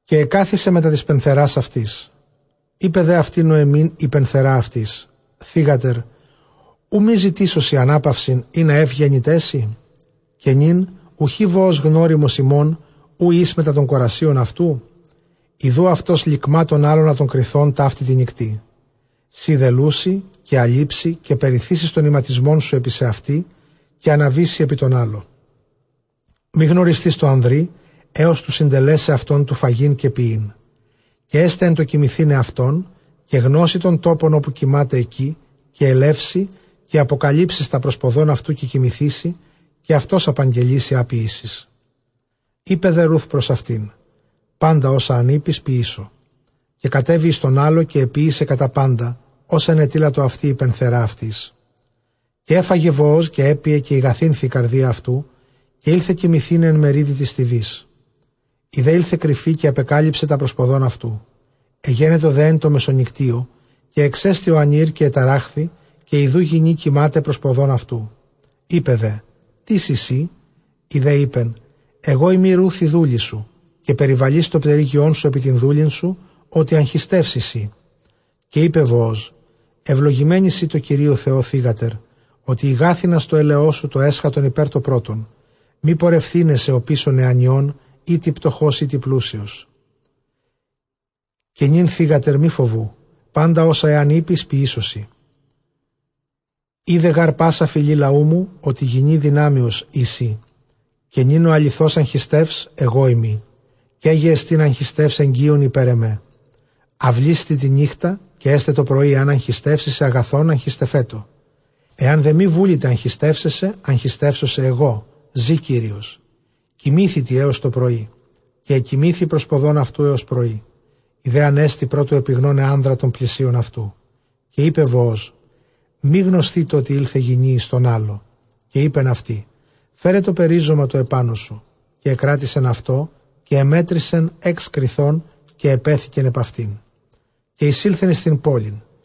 Καὶ ἐκάθισε μετὰ τῆς πενθερᾶς αὐτῆς· εἶπε δὲ αὐτῇ Νωεμὶν ἡ πενθερὰ αὐτῆς, θύγατερ, οὐ μὴ ζητήσω σοι ἀνάπαυσιν, ἵνα εὖ γένηταί σοι; Καὶ νῦν οὐχὶ Βοὸζ γνώριμος ἡμῶν, οὗ ἦς μετὰ τῶν κορασίων αὐτοῦ; ἰδοὺ αὐτὸς λικμᾷ τὸν ἅλωνα τῶν κριθῶν ταύτῃ τῇ νυκτί. Σὺ δὲ λούσῃ, καὶ ἀλείψῃ, καὶ περιθήσεις τὸν ἱματισμόν σου ἐπὶ σὲ, καὶ ἀναβήσῃ ἐπὶ τὸν ἅλω· μὴ γνωρισθῇς τῷ ἀνδρὶ ἕως τοῦ συντελέσαι αὐτὸν τοῦ φαγεῖν καὶ πιεῖν. Καὶ ἔσται ἐν τῷ κοιμηθῆναι αὐτὸν, καὶ γνώσῃ τὸν τόπον ὅπου κοιμᾶται ἐκεῖ, καὶ ἐλεύσῃ καὶ ἀποκαλύψεις τὰ πρὸς ποδῶν αὐτοῦ, καὶ κοιμηθήσῃ, καὶ αὐτὸς ἀπαγγελεῖ σοι ἃ ποιήσεις. Εἶπε δὲ Ῥοὺθ πρὸς αὐτὴν, πάντα ὅσα ἂν εἴπῃς, ποιήσω. Καὶ κατέβη εἰς τὸν ἅλω, καὶ ἐποίησε κατὰ πάντα, ὅσα ἐνετείλατο αὐτῇ ἡ πενθερὰ αὐτῆς. Καὶ ἔφαγε Βοὸζ καὶ ἔπιε, καὶ ἠγαθύνθη ἡ καρδία αὐτοῦ, καὶ ἦλθε κοιμηθῆναι ἐν μερίδι τῆς στοιβῆς· ἡ δὲ ἦλθεν ἐν κρυφῇ, καὶ ἀπεκάλυψε τὰ πρὸς ποδῶν αὐτοῦ. Ἐγένετο δὲ ἐν τῷ μεσονυκτίῳ, καὶ ἐξέστη ὁ ἀνὴρ, καὶ ἐταράχθη, καὶ ἰδοὺ γυνὴ κοιμᾶται πρὸς ποδῶν αὐτοῦ. Εἶπε δὲ, τίς εἶ σύ; ἡ δὲ εἶπεν, ἐγὼ εἰμι Ῥοὺθ ἡ δούλη σου, καὶ περιβαλεῖς τὸ πτερύγιόν σου ἐπὶ τὴν δούλην σου, ὅτι ἀγχιστεὺς εἶ σύ. Καὶ εἶπε Βοὸζ, εὐλογημένη σὺ τῷ Κυρίῳ Θεῷ, θύγατερ, ὅτι ἠγάθυνας τὸ ἔλεός σου τὸ ἔσχατον ὑπὲρ τὸ πρῶτον, μὴ πορευθῆναί σε ὀπίσω νεανιῶν, εἴτοι πτωχὸς εἴτοι πλούσιος. Καὶ νῦν θύγατερ μὴ φοβοῦ, πάντα ὅσα ἐὰν εἴπῃς ποιήσω σοι· οἶδε γὰρ πᾶσα φυλὴ λαοῦ μου ὅτι γυνὴ δυνάμεως εἶ σύ. Καὶ νῦν ὁ ἀληθῶς ἀγχιστεὺς ἐγώ εἰμι· καί γε ἐστὶν ἀγχιστεὺς ἐγγίων ὑπὲρ ἐμέ. Αὐλίσθητι τὴν νύκτα, καὶ ἔσται τοπρωῒ ἐὰν ἀγχιστεύσῃ σε, ἀγαθόν· ἀγχιστευέτω· ἐὰν δὲ μὴ βούληται ἀγχιστεῦσαί σε, ἀγχιστεύσω σε ἐγώ· ζῇ Κύριος· κοιμήθητι ἕως τοπρωΐ. Καὶ ἐκοιμήθη πρὸς ποδῶν αὐτοῦ ἕως πρωΐ· ἡ δὲ ἀνέστη πρὸ τοῦ ἐπιγνῶναι ἄνδρα τὸν πλησίον αὐτοῦ· καὶ εἶπε Βοὸζ, μὴ γνωσθήτω, ὅτι ἦλθε γυνὴ εἰς τὸν ἅλω. Καὶ εἶπεν αὐτῇ, Φέρε τὸ περίζωμα τὸ ἐπάνω σου· καὶ ἐκράτησεν αὐτὸ, καὶ ἐμέτρησεν ἓξ κριθῶν, καὶ ἐπέθηκεν ἐπʼ αὐτὴν, καὶ εἰσῆλθεν εἰς τὴν πόλιν.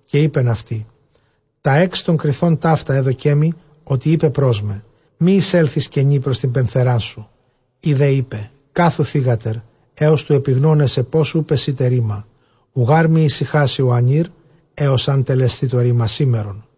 Καὶ εἶπεν αὐτῇ, τὰ ἕξ τῶν κριθῶν ταῦτα ἔδωκέ μοι, ὅτι εἶπε πρὸς μὲ, μὴ εἰσέλθῃς κενὴ πρὸς τὴν πενθεράν σου. Ἡ δὲ εἶπε, κάθου θύγατερ, ἕως τοῦ ἐπιγνῶναί σε πῶς οὐ πεσεῖται ῥῆμα· οὐ γὰρ μὴ ἡσυχάσῃ ὁ ἀνὴρ ἕως ἂν τελεσθῇ τὸ ῥῆμα σήμερον.